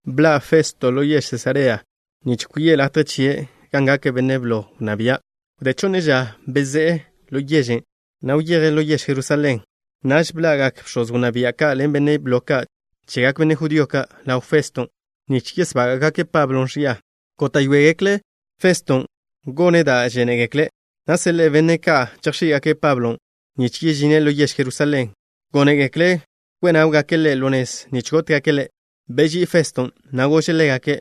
Bḻa' Festo ḻo yež Sesarea nich chaze' latje chie', gan gake' benne' blo wnná bia'. Wdé chonne ža bezé'e ḻo yežen', na' wyeje' ḻo yež Jerusalén. Naž bḻa'gak bx̱oz wnná bia' ka' ḻen benne' blo ka' chegak benne' judío ka' ḻaw Feston', nich yesbága'gake' Pablo ẕia. Góta'yoegekle' Feston' gone' da' žénegekle', na' seḻe'e benne' ka' chejx̱í'gake' Pablon', nich yežine' ḻo yež Jerusalén. Gónegekle' kwe' náwgake' ḻe' ḻo nez nich gótgake' ḻe'. Beží'i Feston', na' gože' ḻégake':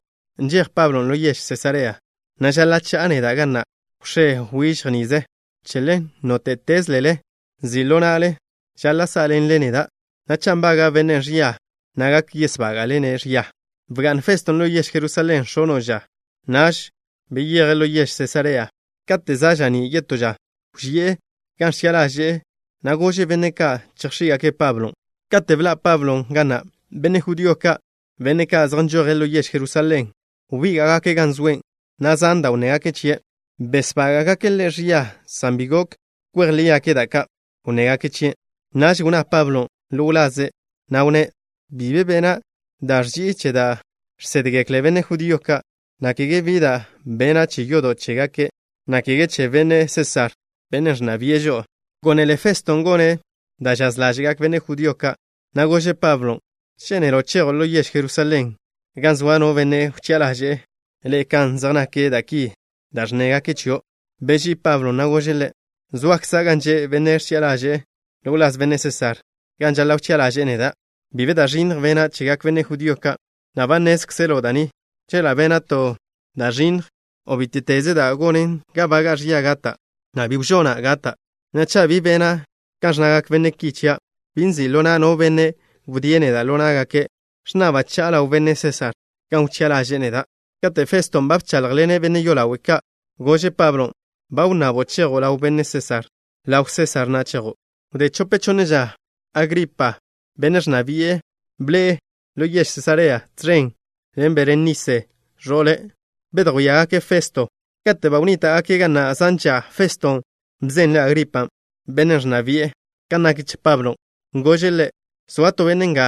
—Nžej Pablon' ḻo yež Sesarea, na' žaḻa' cha'a neda' ga na' wx̱é wižj nize. Che ḻen, nóte'tezlele ḻe'e nzi' ḻo na'le, žaḻa' sá'ḻenle neda', na' cha' nbaga' bennen' ẕia, na' gak yesbága'le-ne' ẕia. Bga'n Feston' ḻo yež Jerusalén x̱ono' ža. Naž beyeje' ḻo yež Sesarea. Kate' za' ža'ní' yetó ža, wži'e gan ẕchi'a ḻaže'e, na' gože' benne' ka' chejx̱í'gake' Pablon'. Kate' bḻa' Pablon' ga na', benne' judío ka', benne' ka' zej nžoje' ḻo yež Jerusalén, wbíga'gake' gan zoe', na' zan da' wnnégake' chie'. Besbága'gake' ḻe' ẕia, san bi gok kwej lígake' da' ka' wnnégake' chie'. Naž wnná Pablon' ḻo wlaze', na' wnné': —Bi be bena' da' ẕži'i che da' žsédgekle benne' judío ka', na' kege bi da' bena' che yodo' chégake', na' kege che benne' Sésar, bennen' ẕnna bi'e žo'o. Gónele Feston' gone' da' žaz ḻáže'gak benne' judío ka', na' gože' Pablon': —¿Žénelo' chejo' ḻo yež Jerusalén, gan soa no benne' wchi'a ḻaže'e le' kan zej nak da' ki da' ẕnnégake' chio'? Beží'i Pablon', na' gože' ḻe': —Zoakza' gan že' benne' ẕchi'a ḻaže'e ḻo wláz benne' Sésar, gan žaḻa' wchi'a ḻaže'e neda'. Bi be da' ẕinnj bena' chegak benne' judío ka', na' ba nnézkzelo' da' ni. Chela' bena' to da' ẕinnj, o bíte'teze da' gonen ga baga'a ẕia gata', na' bi wžona' gata'. Na'a, cha' bi bena' kan ẕnnegak benne' ki chia', bi nzi' ḻo na' no benne' wdíe' neda' ḻo ná'gake'. Ẕnnaba' cha'a ḻaw benne' Sésar gan wchi'a ḻaže'e neda'. Kate' Feston' ba bcháḻjḻene' benne' yolawe' ka', gože' Pablon': —Ba wnnabo' chejo' ḻaw benne' Sésar. Ḻaw Sésar na' chejo'. Wdé chope chonne ža, Agripa, benne' ẕnna bi'e, bḻe'e ḻo yež Sesarea, tẕen ḻen Berenise, ẕo'le'. Bedjwíagake' Festo. Kate' ba wnníta'gake' ga na' zan ža, Feston' bzenle' Agripan', benne' ẕnna bi'e, kan nak che Pablon'. Gože' ḻe': —Zoa to benne' nga,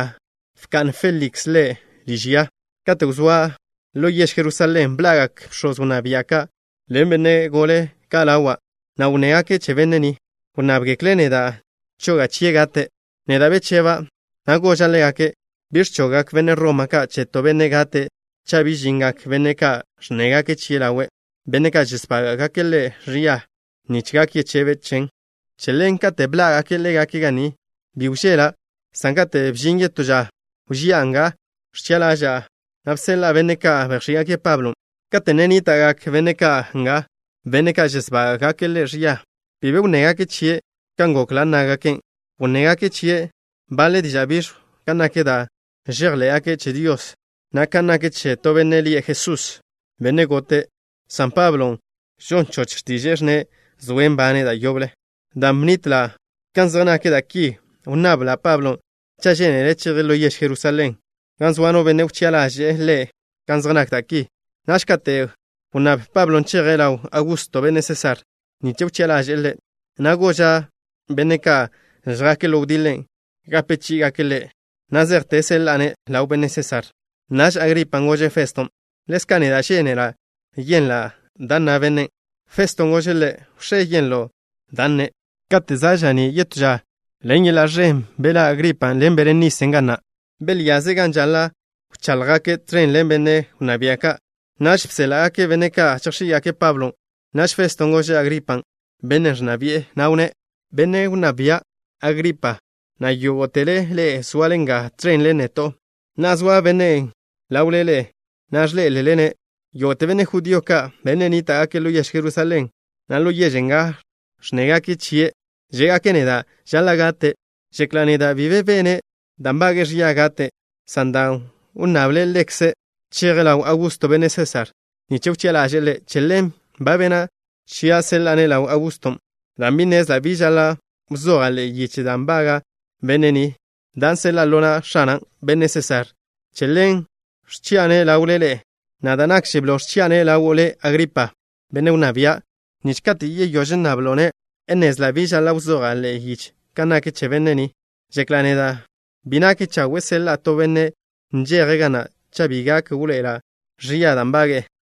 bka'n Féliks ḻe' liž ya. Kate' wzóa' ḻo yež Jerusalén, bḻa'gak bx̱oz wnná bia' ka' ḻen benne' gole ka' ḻawa', na' wnnégake' che benne' ni. Wnnábgekle' neda' choga' chie' gate'. Neda' becheba', na' goža' ḻégake' bi ẕchoggak benne' Roma ka' che to benne' gate' cha' bi žingak benne' ka' ẕnnégake' chie' ḻawe', benne' ka' žesbága'gake' ḻe' ẕia, nich gak yechebe' chen. Che ḻen, kate' bžíngake' ḻégake' ga ni, bi wžela', san kate' bžin yetó ža, wži'a gan ẕchi'a ḻaža'a, na' bseḻa'a benne' ka' bejx̱í'gake' Pablon'. Kate' ne nníta'gak benne' ka' nga, benne' ka' žesbága'gake' ḻe' ẕia, bi be wnnégake' chie' kan gokla' nnágake'. Wnnégake' chie' baḻe diža' biẕjw kan nak da' žejḻé'gake' che Dios, na' kan nak che to benne' lie' Jesús, bennen' gote', san Pablon' žon choch x̱tiže'e ẕnne' zoe' nbane' da' yoble. Dan' bnitla' kan zej nak da' ki, wnnabla' Pablon' cha' žénele' cheje' ḻo yež Jerusalén, gan soa no benne' wchi'a ḻaže'e ḻe' kan zej nak da' ki. Naž kate' wnnáb Pablon' cheje' ḻaw Augusto, benne' Sésar, nich wchi'a ḻaže'e ḻe', na' goža' benne' ka' žjake' ḻo wdiḻe gape chí'igake' ḻe' na' zejte seḻa'a-ne' ḻaw benne' Sésar. Naž Agripan' gože' Feston': —Ḻezka' neda' žénela' yenla' da' nna bennen'. Feston' gože' ḻe': —Wx̱é yenlo' da' nne'. Kate' za' ža'ní' yetó ža, ḻen yeḻa' ẕen beḻá' Agripan' ḻen Berenise ga na'. Belyaze' gan žaḻa' wcháḻjgake', tẕen ḻen benne' wnná bia' ka'. Naž bséḻa'gake' benne' ka' chejx̱í'gake' Pablon'. Naž Feston' gože' Agripan', bennen' ẕnna bi'e, na' wnné': —Benne' wnná bia', Agripa, na' yógo'tele ḻe'e zoale nga tẕen ḻen neto'. Na'a zoa bennen' ḻawle ḻe'e, na' ẕḻé'elele-ne'. Yógo'te benne' judío ka', benne' nníta'gake' ḻo yež Jerusalén, na' ḻo yež nga, ẕnnégake' chie'. Žé'gake' neda' žaḻa' gate'. Žekla' neda' bi be bene' da' nbage'e ẕia gate', san dan' wnnable' ḻekze' cheje' ḻaw Augusto, benne' Sésar, nich wchi'a ḻaže'e ḻe', che ḻen ba bena' chia' seḻa'a-ne' ḻaw Auguston'. Dan' bi nnezla' bi žaḻa' wzoja' ḻe'e yiche da' nbaga' benne' ni, dan' seḻa'a ḻo na' X̱ana', benne' Sésar, che ḻen ẕchi'a-ne' ḻawle ḻe'e, na' da' nakže blo, ẕchi'a-ne' ḻawo' le', Agripa, benne' wnná bia', nich kate' yeyóž ẕnnablo'-ne', nnezla' bi žaḻa' wzoja' ḻe'e yiche kan nak che benne' ni. Žekla' neda' bi nak chawe' seḻa'a to benne' nžeje' ga na' cha' bi gak wḻoe'ela' ẕia da' nbage'e.